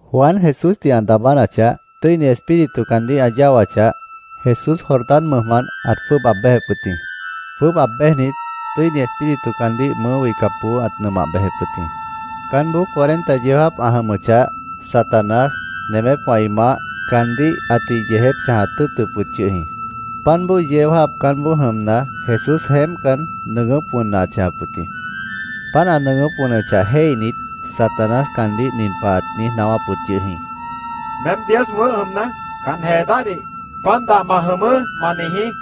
Juan Jesúsdih ã daabánachah, Tʉ́ini Espíritu caandíh ã yáwachah, Jesús Jordán mʉjmant ãt jwʉ́ʉb aab béjep wʉt jĩ. Jwʉ́ʉb aab béjnit, Tʉ́ini Espíritu caandíh mʉʉ́ wihcapboó ãt nʉmah bejep wʉt jĩ. Caánboó cuarenta yeó jáap ã jʉmʉchah, Satanás, nemépwã ĩ maáh, caandíh ãtih yeejép chãjat tʉ́ʉtʉp wʉt yʉh jĩ. Páant bói yeó jáap caánboó jʉmna, Jesús jeémpcan, nʉʉgʉ́p wʉnna ãt chãjap wʉt jĩ. Páant ã nʉʉgʉ́p wʉnʉchah jéihnit, Satanás caandíh nin pah ãt niíj naáwáp wʉt yʉh jĩ: —Meém Dios wʉ̃ʉ́h jʉmna, can jee dáhdih “Pan dah ma jʉmʉʉ́”, ma niijí, ãt niijíp wʉt jĩ.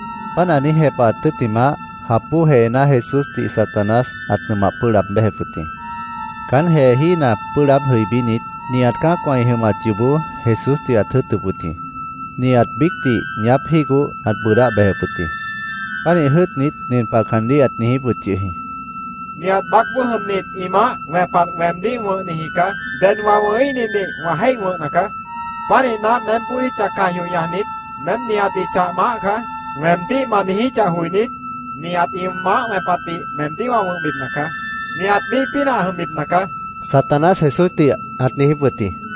Páant ã niíj jepahat tʉ́ttimah, jap bóo jeená Jesúsdih Satanás ãt nʉmah pʉ́ʉh laab béjep wʉt jĩ. Caán jeejína pʉ́ʉh laáb jʉibínit, nihat cã́acwã ĩ jʉmat yoobó Jesúsdih ãt jʉ́ʉtʉp wʉt jĩ. Nihat biícdih ñaáp jígoh, ãt bʉʉdáh bejep wʉt jĩ. Pánih jʉ́ʉtnit, nin pah caandíh ãt niijíp wʉt yʉh jĩ: —Nihat baácboó jʉmnit ĩ maáh wẽpat weemdíh wʉ̃hniji caá. Ded wã wʉ̃híhnidih wã jéih wʉ̃hna caá. Pánihna, meém bódicha caj yoh ñajnit, ‘Meém nihatdih chah maáh caá’, weemdíh ma niijíchah joinít, nihat ĩ maáh wẽpatdih meemdíh wã wʉ̃hbipna caá. Nihat míih pínah ã jʉmbipna caá, Satanás Jesúsdih ãt niijíp wʉt jĩ.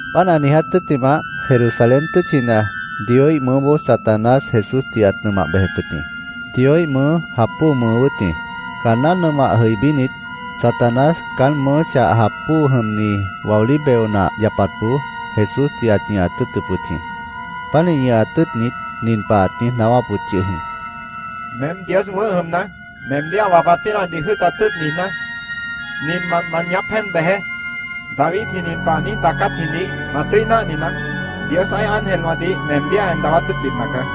Páant ã niiját tʉ́ttimah, Jerusalén tʉ́tchina Dioíh mʉʉ́boó Satanás Jesúsdih ãt nʉmah bejep wʉt jĩ. Dioíh mʉʉ́ jap bóo mʉʉ wʉ́t jĩ. Caanná nʉmah jʉibínit, Satanás caán mʉʉ́ chah jap bóo jʉmni waolí beo nah yapatboó Jesúsdih ãt ñʉhat tʉ́ʉtʉp wʉt jĩ. Pánih ñʉhat tʉ́ʉtnit, nin pah ãt niíj naáwáp wʉt yʉh jĩ: —Meém Dios wʉ̃ʉ́h jʉmna, meemdíh ã wapat pínahdih jʉ́ʉtat tʉ́ʉt niijná, ninmant ma ñaáp jéen bejeé. Davidji nin pah ã niíj daacátjidih ma tʉ́i náhninaá: ‘Dios ã́ih ángelwãdih meemdíh ã en dawát tʉ́ʉtbipna caá.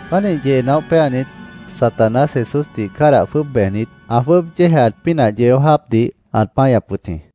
Pánih yee naóh péanit, Satanás Jesúsdih cádah jwʉ́ʉb bejnit, ã jwʉ́ʉb yéejaat pínah yeó jáapdih ãt páñap wʉt jĩ.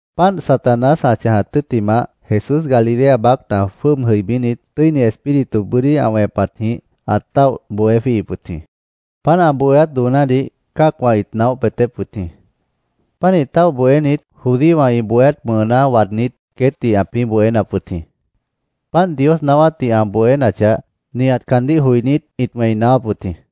Páant Satanás ã chãjat tʉ́ttimah, Jesús Galilea baácna jwʉ́ʉb jʉibínit, Tʉ́ini Espíritu bʉ́dí ã wẽpatjĩh ãt táoh bohé jwíihip wʉt jĩ. Páant ã bohéát doonádih cã́acwã ĩt naóh peetép wʉt jĩ. Pánih táoh bohénit, judíowã ĩ bohéát mʉʉná waadnít, queétdih ãpĩ́ bohénap wʉt jĩ. Páant Dios naáwátdih ã bohénachah, nihat caandíh joinít ĩt wẽi naáwáp wʉt jĩ.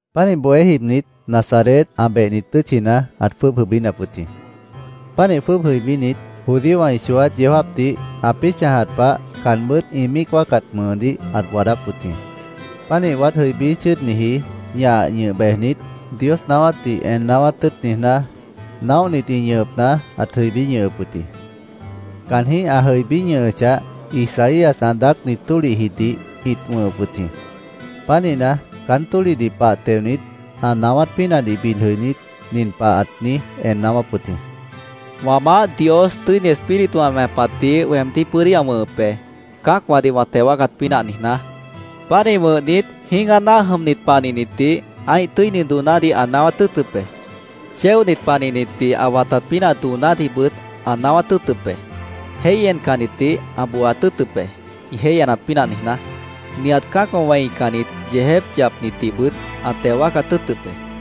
Pánih bohé jibnit, Nazaret, ã behni tʉ́tchina ãt jwʉ́ʉb jʉibínap wʉt jĩ. Pánih jwʉ́ʉb jʉibínit, judíowã ĩ chooát yeó jáapdih, ãpĩ́ chãjat pah caanbʉ́t ĩ míic wáacat mʉʉdíh ãt waadáp wʉt jĩ. Pánih waád jʉibí chʉ́ʉdniji ñah ñʉh bejnit, Dios naáwátdih en naáwát tʉ́ʉt niijná, naóhnit ĩ ñʉhʉpna ãt jʉibí ñʉhʉp wʉt jĩ. Caanjĩ́h ã jʉibí ñʉhʉchah, Isaías ã daácni tólihjidih ĩt wʉ̃hʉp wʉt jĩ. Pánihna, caán tólihdih pah teonit, ã naáwát pínahdih bid jʉinít, nin pah ãt niíj en naáwáp wʉt jĩ: “Wã Maáh Dios Tʉ́ini Espíritu ã wẽpatdih weemdíh bʉ́dí ã wʉ̃hʉp be, cã́acwãdih wã teo wáacat pínah niijná. Pánih wʉ̃hnit, jĩ́gah náah jʉmnit panihnitdih ã́ih tʉ́ini doonádih ã naáwát tʉ́ʉtʉp be. Chéonit panihnitdih ã watat pínah doonádihbʉt ã naáwát tʉ́ʉtʉp be. Jéih encannitdih ã booat tʉ́ʉtʉp be, ĩ jéih enat pínah niijná. Nihat cã́acwã wẽicannit, yeejép yapnitdihbʉt ã teo wáacat tʉ́ʉtʉp be.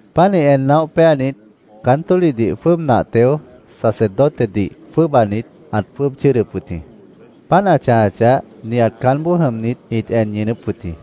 Pánih en naóh péanit, caán tólihdih jwʉ́ʉb nah teo, sacerdotedih jwʉ́ʉbanit, ãt jwʉ́ʉb chʉ́ʉdʉp wʉt jĩ. Páant ã chãjachah, nihat caánboó jʉmnit ĩt en ñʉʉnʉ́p wʉt jĩ.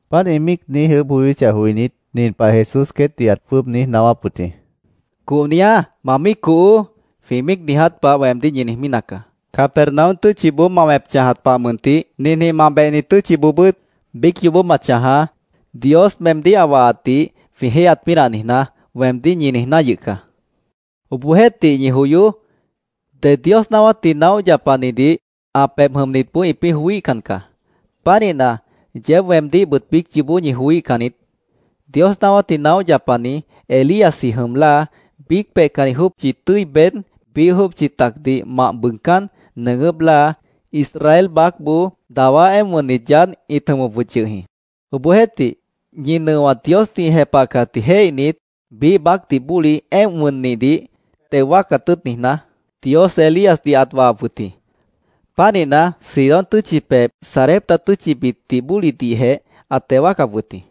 Páant ĩ míic niíj ʉʉ́bh joyóchah joinít, nin pah Jesús queétdih ãt jwʉ́ʉb niíj naáwáp wʉt jĩ: —‘Cohniá, ma míic cohoó’, jwĩ míic niiját pah weemdíh ñi niijmí nacaá. ‘Capernaum tʉ́tchiboó ma wẽp chãjat pah mʉntih ninjĩh ma behni tʉ́tchiboobʉ́t biíc yoobó ma chãjaá, Dios meemdíh ã wahatdih jwĩ jéihyat pínah niijná’, weemdíh ñi niijná yʉh caá. Obohjeéhtih, ñi joyoó. Ded Dios naáwátdih naóh yapanidih ã pebh jʉmnitboó ĩpĩ́ joííhcan caá. Pánihna, yeéb weemdíhbʉt biíc yoobó ñi joííhcan niít. Dios naáwátdih naóh yapani Elíasji jʉm láa, biíc peihcanni jópchi tʉ́i beéd, biíh jópchi tacdih mah bʉʉgcán, nʉʉgʉ́p láa, Israel baácboó dawá éemp wʉnnit yaádh ĩt jʉmʉp wʉt yʉh jĩ. Obohjeéhtih, ñi nʉowã Diosdih ĩ jepahcatdih jéihnit, biíh baácdih bóli éemp wʉnnihdih teo wáacat tʉ́ʉt niijná, Dios Elíasdih ãt wahap wʉt jĩ. Pánihna, Sidón tʉ́tchi pebh Sarepta tʉ́tchibitdih bólidihjeh ãt teo wáacap wʉt jĩ.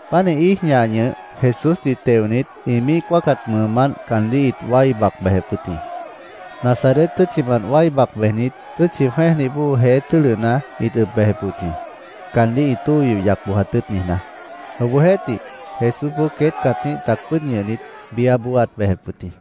Pánih íij ñah ñʉh, Jesúsdih teonit, ĩ míic wáacat mʉʉmánt caandíh ĩt wái bac bejep wʉt jĩ. Nazaret tʉ́tchimant wái bac bejnit, tʉ́tchi jwẽ́ejdih bóo jeé tʉ́lʉhna ĩt ʉb bejep wʉt jĩ, caandíh tóo yoh yac bojat tʉ́ʉt niijná. Obohjeéhtih, Jesúsboó queét cãtíh tac pʉ́ʉd ñʉhnit, biáboó ãt bejep wʉt jĩ.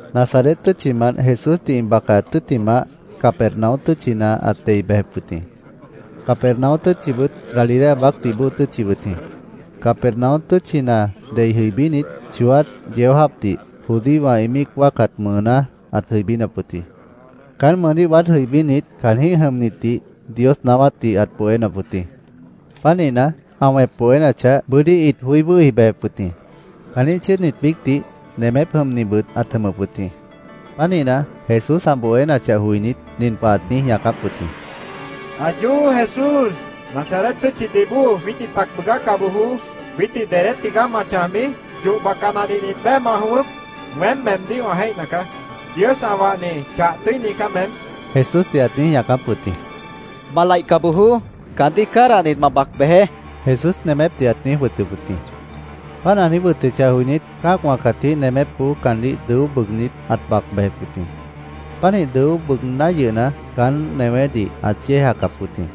Nazaret tʉ́tchimant Jesúsdih ĩ bacaat tʉ́ttimah, Capernaum tʉ́tchina ãt dei bejep wʉt jĩ. Capernaum tʉ́tchibʉt Galilea baácdih bóo tʉ́tchi wʉt jĩ. Capernaum tʉ́tchina dei jʉibínit, chooát yeó jáapdih judíowã ĩ míic wáacat mʉʉná ãt jʉibínap wʉt jĩ. Caán mʉʉdíh waád jʉibínit, caanjĩ́h jʉmnitdih Dios naáwátdih ãt bohénap wʉt jĩ. Pánihna, ã wẽp bohénachah, bʉ́dí ĩt joí wʉ́hi bejep wʉt jĩ. Caanjĩ́h chʉ́ʉdnit biícdih, nemép jʉmnibʉt ãt jʉmʉp wʉt jĩ. Pánihna, Jesús ã bohénachah joinít, nin pah ãt niíj ñaacáp wʉt jĩ: —¡Ayó! Jesús, ¡Nazaret tʉ́tchidih bóo jwiítdih tac bʉʉgáca bojoó! ¿Jwiítdih dedé tigaá ma chãjbi? ¿Yoh bacanadih nit beé ma jʉ̃ʉ́wʉ́p? Weém meemdíh wã jéihna caá. Dios ã wahni, chah tʉ́ini caá meém, Jesúsdih ãt niíj ñaacáp wʉt jĩ. —¡Ma laihca bojoó! ¡Caandíh cádahnit, ma bac bejeé! Jesús nemépdih ãt niijíp wʉt jĩ. Páant ã niíj wʉtʉchah joinít, cã́acwã cãtíh nemépboó caandíh dʉó bʉʉgnít, ãt bac bejep wʉt jĩ. Pánih dʉó bʉʉgná yʉhna, caán newédih ãt yéejacap wʉt jĩ.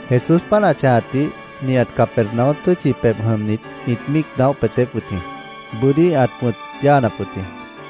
Jesús páant ã chãjatdih nihat Capernaum tʉ́tchi pebh jʉmnit ĩt míic naóh peetép wʉt jĩ. Bʉ́dí ãt wʉ̃t yáanap wʉt jĩ.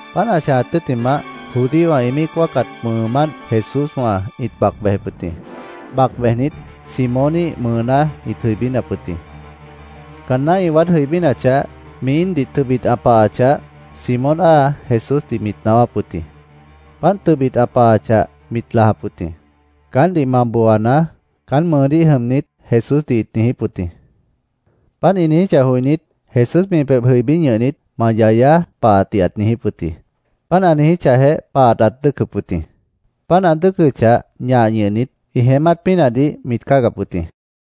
Páant ã chãjat tʉ́ttimah, judíowã ĩ míic wáacat mʉʉmánt Jesúswã ĩt bac bejep wʉt jĩ. Bac bejnit, Simóníh mʉʉná ĩt jʉibínap wʉt jĩ. Caanná ĩ waád jʉibínachah, mi íindih tʉbit ã pahachah, Simón áa Jesúsdih mit naáwáp wʉt jĩ. Páant tʉbit ã pahachah, mit lajap wʉt jĩ. “Caántdih ma booanaá”, caán mʉʉdíh jʉmnit Jesúsdih ĩt niijíp wʉt jĩ. Páant ĩ niijíchah joinít, Jesús mi pebh jʉibí ñʉhnit, “Ma yayaá”, pahatdih ãt niijíp wʉt jĩ. Páant ã niijíchahjeh, pahat ãt dʉ́ʉcʉp wʉt jĩ. Páant ã dʉ́ʉcʉchah, ñah ñʉhnit, ĩ jeémát pínahdih mit cáagap wʉt jĩ.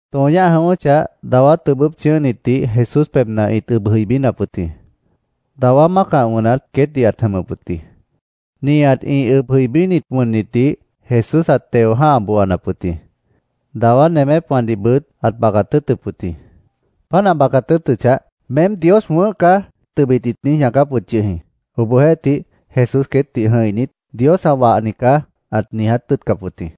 Tõo ñáh jʉ̃ʉ́wʉ́chah, dawá tʉbʉ́p chʉ̃ʉ́hnitdih Jesús pebhna ĩt ʉb jʉibínap wʉt jĩ. Dawá mácah wʉnat queétdih ãt jʉmʉp wʉt jĩ. Nihat ĩ ʉb jʉibínit wʉnnitdih Jesús ãt teo jã́ha booanap wʉt jĩ. Dawá nemépwãdihbʉt ãt bacat tʉ́ʉtʉp wʉt jĩ. Páant ã bacat tʉ́ʉtʉchah, —¡Meém Dios wʉ̃ʉ́h caá! tʉbit ĩt niíj ñaacáp wʉt yʉh jĩ. Obohjeéhtih, Jesús queétdih jʉ̃ihnit, “Dios ã wahni caá”, ãt niiját tʉ́ʉtcap wʉt jĩ.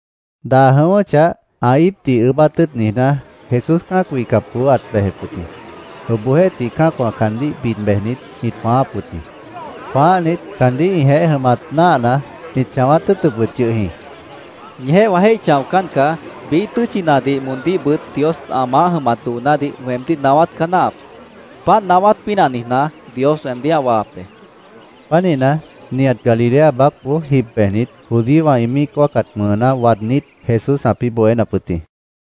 Daa jʉ̃ʉ́wʉ́chah, ã íipdih ʉʉ́bát tʉ́ʉt niijná, Jesús cã́ac wihcapboó ãt bejep wʉt jĩ. Obohjeéhtih, cã́acwã caandíh bid bejnit, ĩt jwãááp wʉt jĩ. Jwãáhnit, caandíh ĩjeéh jʉmat náahna, ĩt chãwát tʉ́ʉtʉp wʉt yʉh jĩ. —Ñijeéh wã jéih chãocán caá. Biíh tʉ́tchinadih moondíhbʉt Dios ã maáh jʉmat doonádih weemdíh naáwát caá náahap. Páant naáwát pínah niijná, Dios weemdíh ã wahap be, Jesús queétdih ãt niijíp wʉt jĩ. Pánihna, nihat Galilea baácboó jib bejnit, judíowã ĩ míic wáacat mʉʉná waadnít, Jesús ãpĩ́ bohénap wʉt jĩ.